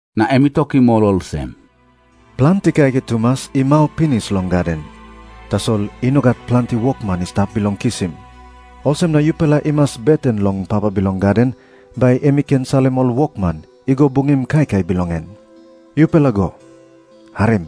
Na em i tokim ol olsem, “Planti kaikai tumas i mau pinis long gaden, tasol i no gat planti wokman i stap bilong kisim. Olsem na yupela i mas beten long Papa bilong gaden, bai em i ken salim ol wokman i go bungim kaikai bilong en. “Yupela go. Harim.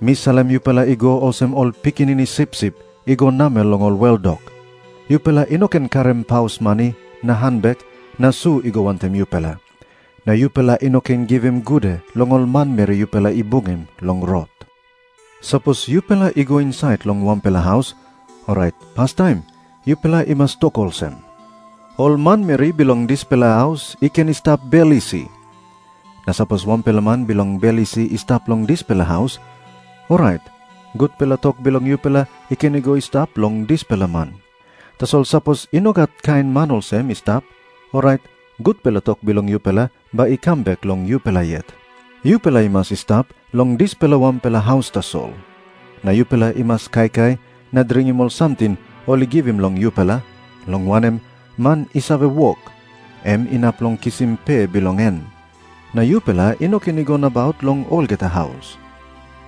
Mi salim yupela i go olsem ol pikinini sipsip i go namel long ol weldok. Yupela i no ken karim paus mani na hanbek na su i go wantaim yupela. Na yupela i no ken givim gude long ol manmeri yupela i bungim long rot. Sapos yupela i go insait long wanpela haus, orait pastaim yupela i mas tok olsem, ‘Ol manmeri bilong dispela haus i ken i stap bel isi.’ Na sapos wanpela man bilong bel isi i stap long dispela haus, orait gutpela tok bilong yupela i ken i go i stap long dispela man. Tasol sapos i no gat kain man olsem i stap, orait gutpela tok bilong yupela bai i kam bek long yupela yet. Yupela i mas i stap long dispela wanpela haus tasol. Na yupela i mas kaikai na dringim ol samting ol i givim long yupela, long wanem, man i save wok, em inap long kisim pe bilong en. Na yupela i no ken i go nabaut long olgeta haus.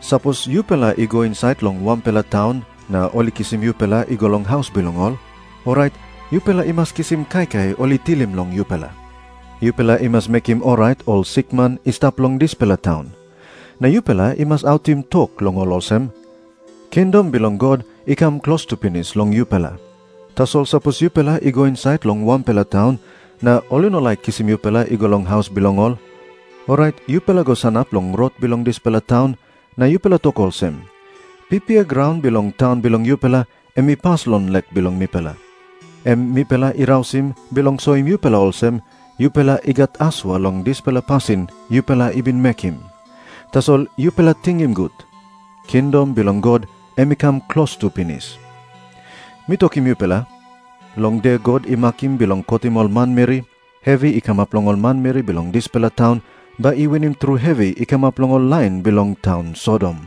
“Sapos yupela i go insait long wanpela taun na ol i kisim yupela i go long haus bilong ol, orait yupela i mas kisim kaikai ol i tilim long yupela. Yupela i mas mekim orait ol sikman i stap long dispela taun. Na yupela i mas autim tok long ol olsem, ‘Kingdom bilong God i kam klostu pinis long yupela.’ Tasol sapos yupela i go insait long wanpela taun, na ol i no laik kisim yupela i go long haus bilong ol, orait yupela go sanap long rot bilong dispela taun, na yupela tok olsem, ‘Pipia graun bilong taun bilong yupela em i pas long lek bilong mipela, em mipela i rausim bilong soim yupela olsem, yupela i gat asua long dispela pasin yupela i bin mekim. Tasol yupela tingim gut. Kingdom bilong God em i kam klostu pinis.’ Mi tokim yupela, long de God i makim bilong kotim ol manmeri, hevi i kamap long ol manmeri bilong dispela taun bai i winim tru hevi i kamap long ol lain bilong taun Sodom.”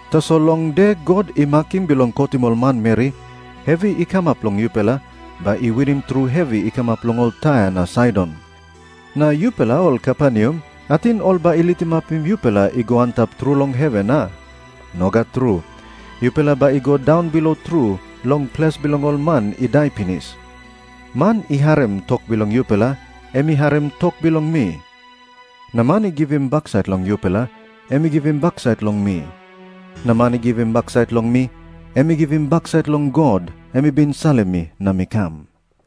Tasol long de God i makim bilong kotim ol manmeri, hevi i kamap long yupela bai i winim tru hevi i kamap long ol Tair na Saidon. Na yupela ol Kaperneam, ating ol bai i litimapim yupela i go antap tru long heven, a? Nogat tru. Yupela bai i go daunbilo tru long ples bilong ol man i dai pinis.” Na Jisas i tokim ol disaipel olsem, “Man i harim tok bilong yupela, em i harim tok bilong mi. Na man i givim baksait long yupela, em i givim baksait long mi. Na man i givim baksait long mi, em i givim baksait long God, em i bin salim mi na mi kam.”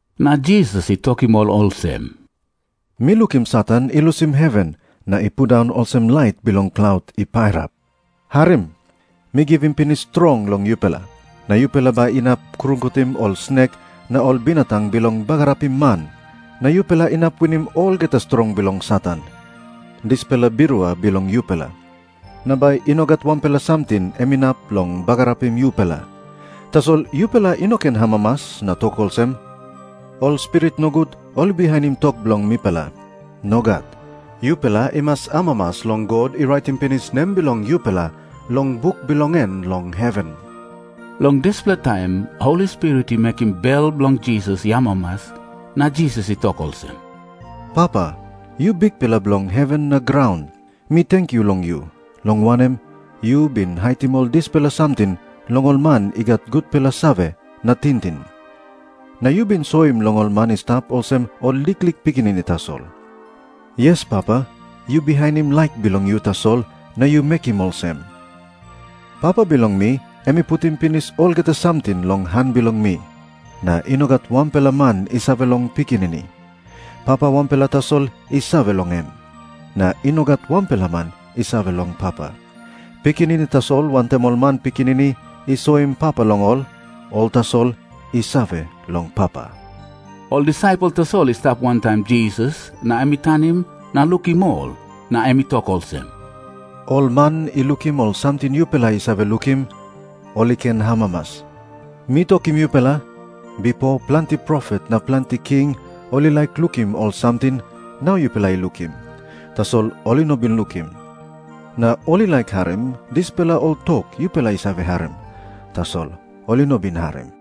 Na Jisas i tokim ol olsem, “Mi lukim Satan i lusim heven na i pundaun olsem lait bilong klaut i pairap. Harim. Mi givim pinis strong long yupela, na yupela bai inap krungutim ol snek na ol binatang bilong bagarapim man, na yupela inap winim olgeta strong bilong Satan, dispela birua bilong yupela. Na bai i no gat wanpela samting em inap long bagarapim yupela. Tasol yupela i no ken amamas na tok olsem, ‘Ol spirit nogut ol i bihainim tok bilong mipela.’ Nogat. Yupela i mas amamas long God i raitim pinis nem bilong yupela long buk bilong en long heven.” Long dispela taim Holi Spirit i mekim bel bilong Jisas i amamas, na Jisas i tok olsem, “Papa, yu Bikpela bilong heven na graun, mi tenkyu long yu, long wanem, yu bin haitim ol dispela samting long ol man i gat gutpela save na tingting, na yu bin soim long ol man i stap olsem ol liklik pikinini tasol. Yes, Papa, yu bihainim laik bilong yu tasol na yu mekim olsem.” Na Jisas i tok moa olsem, “Papa bilong mi em i putim pinis olgeta samting long han bilong mi. Na i no gat wanpela man i save long Pikinini. Papa wanpela tasol i save long em. Na i no gat wanpela man i save long Papa. Pikinini tasol wantaim ol man Pikinini i soim Papa long ol, ol tasol i save long Papa.” Ol disaipel tasol i stap wantaim Jisas, na em i tanim na lukim ol, na em i tok olsem, “Ol man i lukim ol samting yupela i save lukim, ol i ken amamas. Mi tokim yupela, bipo planti profet na planti king ol i laik lukim ol samting nau yupela i lukim, tasol ol i no bin lukim. Na ol i laik harim dispela ol tok yupela i save harim, tasol ol i no bin harim.”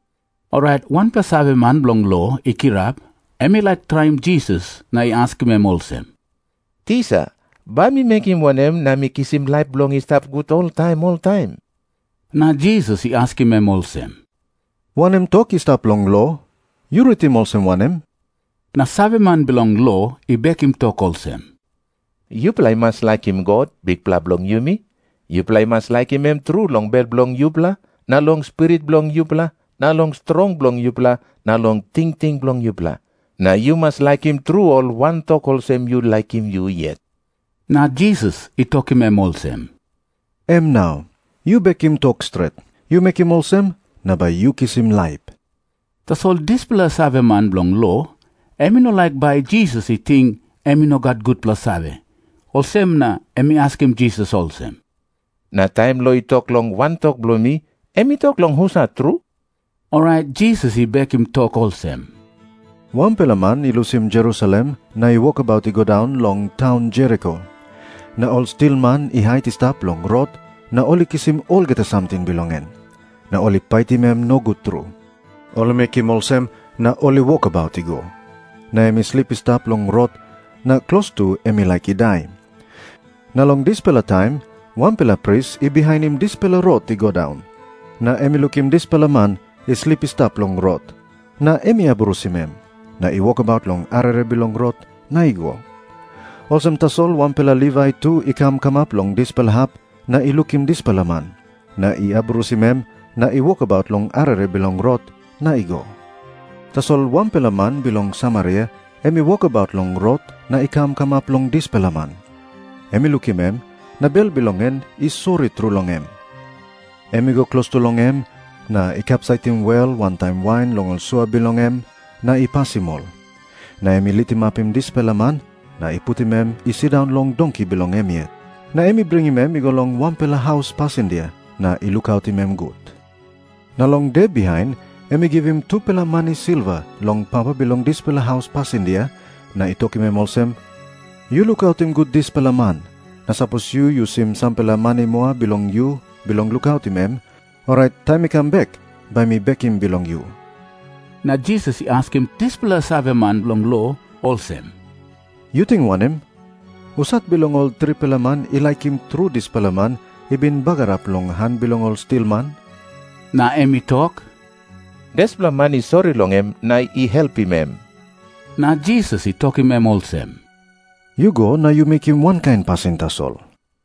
Orait wanpela saveman bilong lo i kirap. Em i laik traim Jisas na i askim em olsem, “Tisa, bai mi mekim wanem na mi kisim laip bilong i stap gut oltaim oltaim?” Na Jisas i askim em olsem, “Wanem tok i stap long lo? Yu ritim olsem wanem?” Na saveman bilong lo i bekim tok olsem, “ ‘Yupela i mas laikim God, Bikpela bilong yumi. Yupela i mas laikim em tru long bel bilong yupela na long spirit bilong yupela na long strong bilong yupela na long tingting bilong yupela. Na yu mas laikim tru ol wantok olsem yu laikim yu yet.’” Na Jisas i tokim em olsem, “Em nau. Yu bekim tok stret. Yu mekim olsem, na bai yu kisim laip.” Tasol dispela saveman bilong lo, em i no laik bai Jisas i ting em i no gat gutpela save, olsem na em i askim Jisas olsem, “Na taim lo i tok long wantok bilong mi, em i tok long husat tru?” Orait Jisas i bekim tok olsem, “Wanpela man i lusim Jerusalem na i wokabaut i go daun long taun Jeriko. Na ol stilman i hait i stap long rot, na ol i kisim olgeta samting bilong em, na ol i paitim em nogut tru. Ol i mekim olsem, na ol i wokabaut i go. Na em i slip i stap long rot, na klostu em i laik i dai. Na long dispela taim wanpela pris i bihainim dispela rot i go daun. Na em i lukim dispela man i slip i stap long rot, na em i abrusim em, na i wokabaut long arere bilong rot na i go. Olsem tasol wanpela Livai tu i kam kamap long dispela hap, na i lukim dispela man, na i abrusim em, na i wokabaut long arere bilong rot na i go. “Tasol wanpela man bilong Samaria em i wokabaut long rot na i kam kamap long dispela man. Em i lukim em, na bel bilong en i sori tru long em. Em i go klostu long em, na i kapsaitim wel wantaim wain long ol sua bilong em, na i pasim ol. Na em i litimapim dispela man, na i putim em i sindaun long donki bilong em yet. Na em i bringim em i go long wanpela haus pasindia na i lukautim em gut. Na long de bihain em i givim tupela mani silva long papa bilong dispela haus pasindia, na i tokim em olsem, ‘Yu lukautim gut dispela man. Na sapos yu yusim sampela mani moa bilong yu bilong lukautim em, orait taim mi kam bek, bai mi bekim bilong yu.’” Na Jisas i askim dispela saveman bilong lo olsem, “Yu ting wanem? Husat bilong ol tripela man i laikim tru dispela man i bin bagarap long han bilong ol stilman?” Na em i tok, “Dispela man i sori long em na i helpim em.” Na Jisas i tokim em olsem, “Yu go na yu mekim wankain pasin tasol.”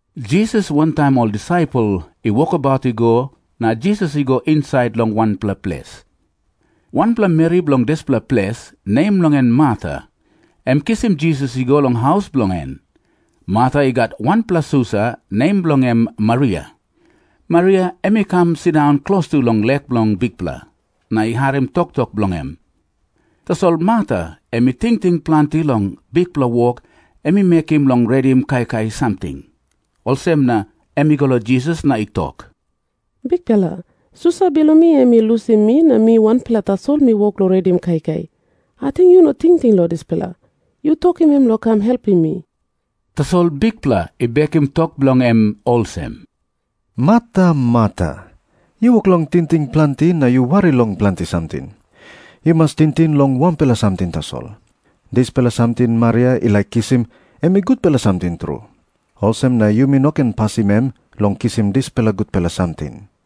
Jisas wantaim ol disaipel i wokabaut i go, na Jisas i go insait long wanpela ples. Wanpela meri bilong dispela ples, nem bilong en Marta, em i kisim Jisas i go long haus bilong en. Marta i gat wanpela susa, nem bilong en Maria. Maria em i kam sindaun klostu long lek bilong Bikpela, na i harim toktok bilong em. Tasol Marta em i tingting planti long bikpela wok em i mekim bilong redim kaikai samting. Olsem na em i go long Jisas na i tok, “Bikpela, susa bilong mi em i lusim mi na mi wanpela tasol mi wok long redim kaikai. Ating yu no tingting long dispela? Yu tokim em long kam helpim mi.” Tasol Bikpela i bekim tok bilong em olsem, “Marta, Marta, yu wok long tingting planti na yu wari long planti samting. Yu mas tingting long wanpela samting tasol. Dispela samting Maria i laik kisim, em i gutpela samting tru, olsem na yumi no ken pasim em long kisim dispela gutpela samting.”